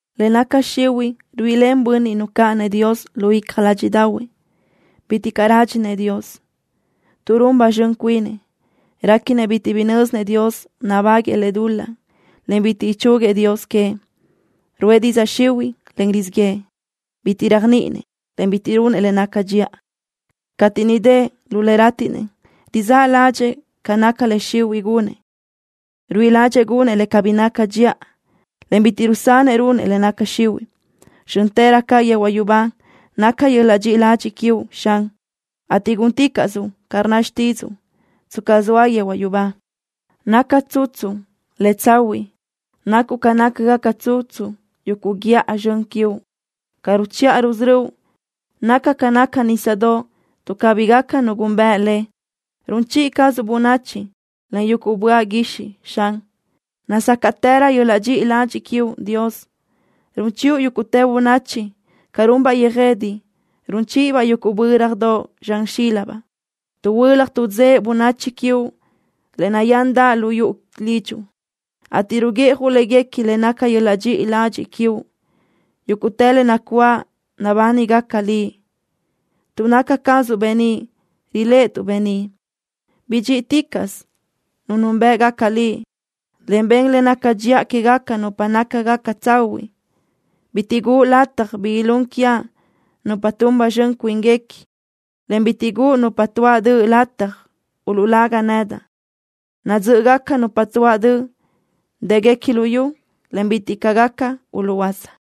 Le naca xihuiʼ ruíʼilen bönniʼ nucáʼanëʼ Dios lu icja ládxiʼdaʼahuëʼ. Bitiʼ caʼ rádxinëʼ Dios. Tuʼ run ba zxön cuinëʼ réquinëʼ bitiʼ nö́zinëʼ Dios nabáguëʼë lëʼ dul-laʼ, en bitiʼ ichúguiëʼ Dios queëʼ. Ruʼë didzaʼ xihuiʼ, en rizíʼ yëʼë. Bitiʼ réajniʼinëʼ, en bitiʼ runëʼ le naca dxiʼa. Cateʼ niʼ dëʼ lu le rátiʼnëʼ rizáʼ ládxëʼë ca naca le xihuiʼ gunëʼ. Ruíʼi ládxëʼë gunëʼ le cabí naca dxiʼa, en bitiʼ rusanëʼ runëʼ le naca xihuiʼ. Zxö́ntërö ca yehuaʼ yubá naca yöl-laʼ dxiʼi ladxiʼ quiuʼ, Xan, ateʼ gúnticaʼsuʼ ca rnna xtídzuʼu, tsca zoa yehuaʼ yubá. Naca tsutsu le tsahuiʼ nacuʼ ca nácagaca tsutsu yuguʼ guíʼa zxön quiuʼ. Ca ruchiʼa rusörö́uʼ naca ca naca nísadoʼ, tuʼ cabí gaca nu gúnbëʼe le. Run chiʼi cazuʼ bönachi, en yugu böaʼ guixiʼ, Xan. Nazácaʼtërö yöl-laʼ dxiʼi ladxiʼ quiuʼ, Dios. Run chiʼu yúguʼtë bönachi ca runbaʼ yöjede, run chíʼibaʼ yuguʼ bö́radoʼ zxan xílabaʼ. Tuʼhuölaj tuʼdzëʼe bönachi quiuʼ le nayándaʼ lu yuʼu lidxuʼ, ateʼ ruguiʼjuʼ léguequi le naca yöl-laʼ dxiʼi ladxiʼ quiuʼ. Yúguʼtë le nacuáʼ nabánigaca Liʼ. Tuʼ naca cazuʼ beníʼ riléʼetuʼ beníʼ. Bidxíʼiticaʼsö nupa núnbëʼgaca Liʼ, en ben le naca dxiʼa quégaca nupa nácagaca tsahuiʼ. Bitiʼ guʼu lataj bi ilún quiaʼ nupa tun ba zxön cuínguequi, en bitiʼ guʼu nupa tuáʼ döʼ lataj uluʼlagaʼ nedaʼ. Nadzö́ʼögaca nupa tuáʼ döʼ. Dë́guequi luyú, en bitiʼ caʼ gaca uluʼhuöása.